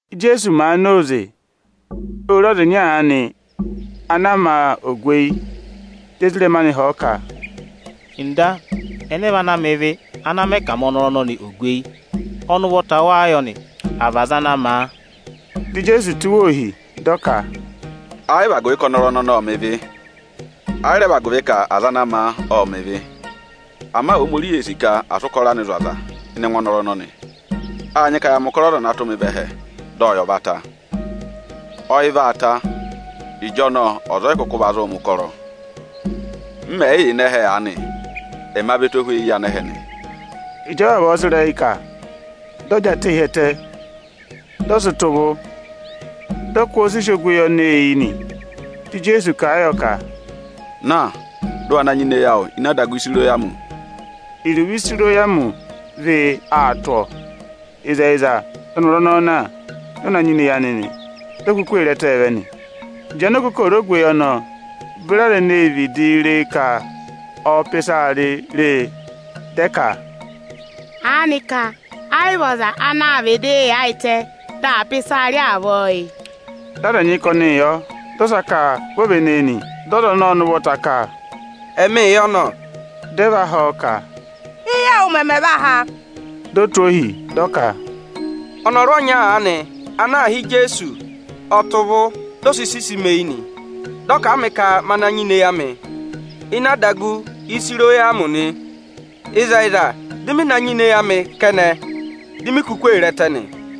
Íjeesu màa na óze, ô re ọza ịnya aanị ana a ma ogweyi. Dị ezirẹma anị họ̀ ọ ka, “Ọga, ẹnẹ vị ana mẹ ịvị, ana mẹ ka à ma ọnọrụ ọnọnị ogweyi? Ọnị ụvọta wáá yọ nị, à vị aza ana ma a?” Dị Ijeesu tụ́ wa ohi, dị ọ ka, “Ẹ yị vị agụvị ka ọnọrụ ọnọnị ộ mẹ̀ ịvị, ẹ yị rẹ vị agụvị ka aza ana ma a, ộ mẹ̀ ịvị. Ama Ohomorihi ee sì ka à sị ụkọrọ anị zụ̀ aza ịnị ẹngụ ọnọrụ ọnọnị. Â nyị ka ya mẹ̀ ụkọrọ Ọza ana tụ́ mị vẹ ẹhẹ dị ọyị ọ̀ va ta. Ọyị vaa ta, ịjọnọọ ọza ọ yị kụkụ va zụụ mẹ̀ ụkọrọ. M mẹ̀ yị yà ịnị ẹhẹ aanị, ẹma vị ẹtohweyi yị anẹhẹ nị.” Ịjị ọ vavọọ sị ịrẹyị kà, dị ọ jị atẹ hi ẹtẹ, dị ọ sị tọ̀ ụvụ, dị ọ kụ́ ọọ sisi ogweyi ọnọọ eyi nị. Dị Ijeesu kà a yọ ka, “Na, dị ụ wa na nyịna eyi awụ ini adagu Ịsayịrọmị.” (Iruvo “Ịsayịrọmị” ọ vị “â tụ́ ọọ”.) Ịzẹyịza, dị ọnọrụ ọnọọ na, dị ọ na nyịna eyi anị, di o kuku ee re ẹtẹẹ vẹ nị. Ịjị anokokooro ogweyi ọnọọ beri aza eneē vidii re e ka ọọ̄ pà ịsaa rị re e, dị ẹ ka, “Aanịka ẹ yị vị ọza anaā vịdịị yaayịtẹ dị aa pà ịsaa rị avọọ yị?” Dị aza ẹnyị ka ọnịị yọ, dị ọsa ka vi o véné e nị. Dị ọza ọnọọ ụvọta ka, “Ẹmịị yọ nọ!” Dị ẹ va họ̀ ọ ka, “Éyi awụ mẹmẹ va há?” Di o tụ́ ohi, dị ọ ka, “Ọnọrụ ọnya aanị ana aā hị́ Ijeesu, ọ tọ̀ ụvụ, di o si sisi mi eyi nị. Dị ọ kà a mị ka ma na nyịna eyi amị ini adagu Ịsayịrọmị nị. Ịzẹyịza, dị mị na nyịna eyi amị kẹnẹ, di mi kuku ee re ẹtẹ nị.”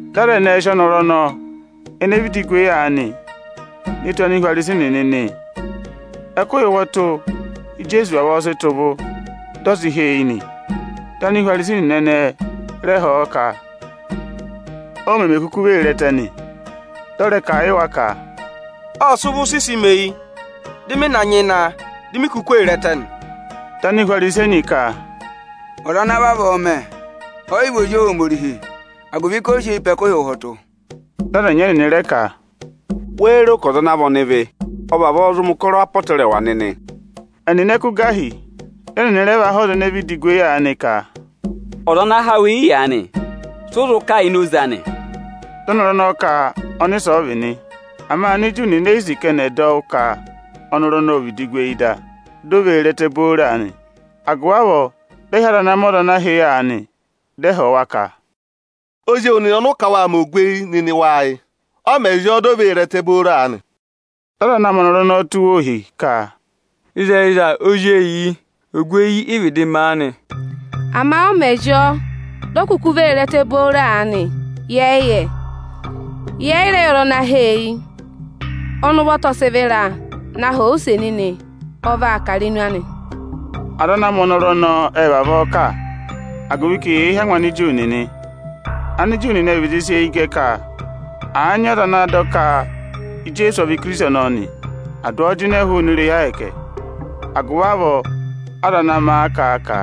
Dị aza ẹnẹẹ sị ọnọrụ ọnọọ ene vịdị gu eyi aanị ne tù Anihwarisi nịnị nị. Ẹkụhị ụhwọtụ Íjeesu vavọọ sị tọ̀ ụvụ, dị ọ ha eyi nị. Dị Anihwarisi nịnị ẹnị rẹ họ̀ ọ ka, o meme kuku vee re ẹtẹ nị. Dị ọ rẹ kà a yị wa ka, “Ộ sị ụvụ sisi mi eyi, dị mị na nyịna a, di mi kuku ee re ẹtẹ nị.” Dị Anihwarisi ẹnyị ka, “Ọza ana vavọọ mẹ, ọ yị vị ọza Ohomorihi, agụvị ka o yi sị eyi pe ẹkụhị ụhwọtụ.” Dị aza ẹnyị ẹnịnị rẹ ka, “Wéé ro ka ọza ana vị ọnịvị ộ vavọọ zụ mẹ̀ ụkọrọ apọtẹrẹwa nịnị?” Ẹnịnị ẹ kụ́ gà hi. Dị ẹnịnị rẹ va họ̀ ọza ene vịdị gu eyi aanị ka, “Ọza ana há wụ eyi aanị, sị ụ zụ kà ini oze anị?” Dị ọnọrụ ọnọọ ka ọnịsẹ ọ vị nị. Ama Aniju nịnị e yi sì ka ẹnị ẹ̀ dọ wụ́ ka ọnọrụ ọnọọ ô vịdị gu eyi da, di o vee re ẹtẹ booro aanị. Agụvị avọọ dị ẹ hị́ aza ana ma ọza ana a há eyi aanị, dị ẹ họ̀ wa ka, “Ozi ewu nịnị ọnị ụ kà a ka wâ ma ogweyi nịnị wáá yị? Ọ mẹ̀ zị ọọ, di o vee re ẹtẹ booro aanị?” Dị aza ana ma ọnọrụ ọnọọ tụ́ wa ohi ka, “Ịzẹyịza ozi eyi yị, ogweyi ị vịdị ma a nị. Ama ọ mẹ̀ zị ọọ, di o vee re ẹtẹ booro aanị, yẹ yị yẹ. Yẹ yị rẹ yẹ ọza ana há a eyi. Ọnị ụvọta ọ sị vịra, na họ̀ ọ use nịnị! Ọ vaa kà irenu anị.” Aza ana ma ọnọrụ ọnọọ, ệ vavọọ kà, agụvị ka eyee hí angwa Aniju nịnị. Aniju nịnị ệ vịdị sị eyi gẹ ka àa nyị ọza ana dọ ka Ijeesu ọ vị Ikirisiti ọnọọ nị, à dụ ọọ jịnẹ hụụnị irehi Ohomorihi. Agụvị avọọ aza ana ma a kà a ka,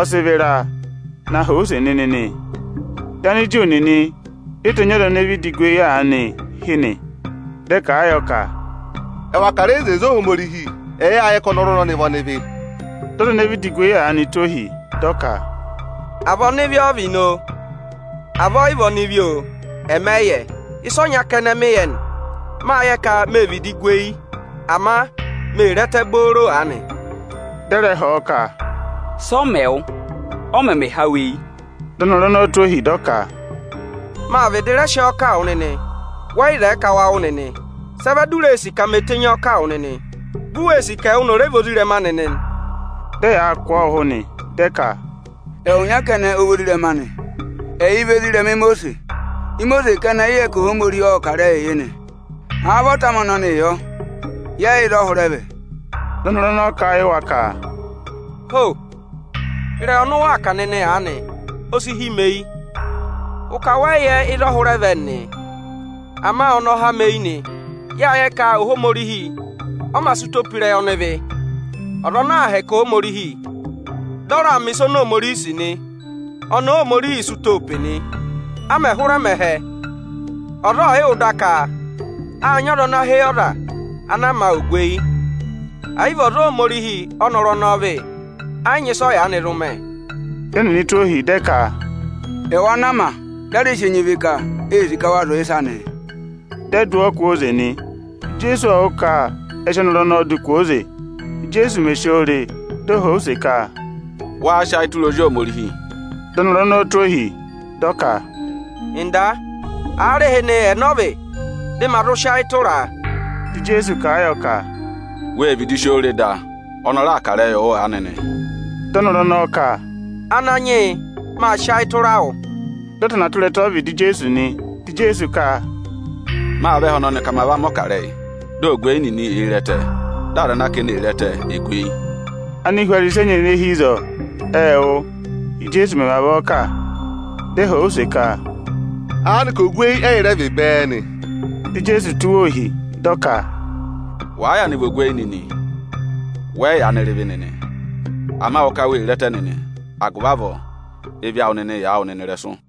“Ọ sị vịra, na họ̀ ọ use nịnị!” nị. Dị Aniju nịnị re tenyi ọza ene vịdị gu eyi aanị hị́ nị. Dị ẹ kà a yọ ka, “Ẹwà kà ịrẹyị ịzẹyịza Ohomorihi; ẹyị â yẹ ka ọnọrụ ọnọọ vị ọnịvị.” Dị ọza ene vịdị gu eyi aanị, tụ́ ohi, dị ọ ka, “À vị ọnịvị ọ vị nị oo, à vị ọ yị vị ọnịvị oo, ẹmị ẹ yị yẹ. Ịsa ọnya kẹnẹ mị yẹ nị, mâ yẹ ka mê vịdị gu eyi, ama mee re ẹtẹ booro aanị.” Dị ẹ rẹ họ̀ ọ ka, “Sị ọ mẹ wụ? Ọ mẹmẹ há wụ eyi?” Dị ọnọrụ tụ́ ohi, dị ọ ka, “Mâ vịdị rẹ sị ọọ kà a wụ nịnị, wẹ yị zẹẹ ka wa wụ́ nịnị. Sị ẹ vẹ di u ree sì ka me tenyi ọọ kà a wụ nịnị? Vi u wee sì ka ẹwụ nịnị ọ̀ rẹ vị ezirẹma anị nị?” Dị ẹyaa kụ̀ ọọ ụhụ nị, dị ẹ ka, “Ẹwụ nya kẹnẹ ọ vị ozirẹma anị, ẹ yị vị ezirẹma Imosiisi. Imosiisi kẹnẹ ị yẹ ka Ohomorihi ộ kà ịrẹyịị yị nị; àa vị ọta amị ọnọọ yọ, yẹ yị yẹ ịzọọ hụrẹ vẹ.” Dị ọnọrụ ọnọọ kà a yị wa ka, “Ho! Ịrẹyị ọnị ụ waa kà nịnị aanị, o si hí mi eyi. Ụ ka wẹ yị yẹ ịzọọ hụrẹ vẹ nịnị, ama ọnị ọ há ẹmị eyi nị. Yâ yẹ ka Ohomorihi ọ mā sị ụtọ pe ịrẹyị ọnịvị. Ọza ana àa hẹkẹ Ohomorihi, dị ọ raa mẹ̀ ịsa oni Ohomorihi sì nị, ọnị Óhomorihiī sị ụtọọ pe nị. A mẹ̀ hụrẹ mẹ ẹhẹ, ọza ọọ̀ yị wụ́ da ka â nyị ọza ana há eyi ọza ana a ma ogweyi. Ẹ̀ yị vị ọza Ohomorihi ọ́nọrụ ọnọọ vị, ẹ yị nyị ịsị ọ yaanị zụ mẹ.” Dị ẹnịnị tụ́ ọọ ohi, dị ẹ ka, “Ẹwụ ana a ma, da a rẹ sị enyi ịvị kà, ee sì ka wa zụ̀ yị ịsa nịị? Dị ẹ dụ ọọ kwooze nị.” Ijeesu ộ wụ́ ka ẹ sị ọnọrụ ọnọọ dụ kwooze. Ịjị o re e, ộ họ̀ ọ use ka, “Wáá sị ayị tụra Ozi Ohomorihi?” Dị ọnọrụ ọnọọ tụ́ ohi, dị ọ ka, “Ọga, aarịhịnị ẹnẹ ọ vị, dị ma zụ sị ayị tụra a?” Dị Ijeesu kà a yọ ka, “Wê vịdị si oo re da; ọnị ọ raa kà ịrẹyịị wụ aanị nị.” Dị ọnọrụ ọnọọ ka, “Ananyị yị, mâ sị ayị tụra wụ”, dị ọ tana tụra ẹtẹ ọ́vịdị Ijeesu nị. Dị Ijeesu ka, “Mâ vẹ ẹhẹ ọnọnị ka ma va mẹ̀ ọkarẹyị, dị ogweyi nịnị èe re ẹtẹ, dị aza ana ka eni ee re ẹtẹ è gu eyi.” Anihwarisi ẹnyị ene hi ịzọọ ệ wụ́, Íjeesu mẹ̀ vavọọ kà. Dị ẹ họ̀ ọ use ka, “Aanịka ogweyi ẹ́yị rẹ vị bẹẹ nị?” Dị Ijeesu tụ́ wa ohi, dị ọ ka, “Wàa yaanị vị ogweyi nịnị, wẹ yị yaanị rị ịvị nịnị; ama ụ ka wee re ẹtẹ nịnị, agụvị avọọ ịvị awụ nịnị yị yà wụ nịnị ịrẹsụ.”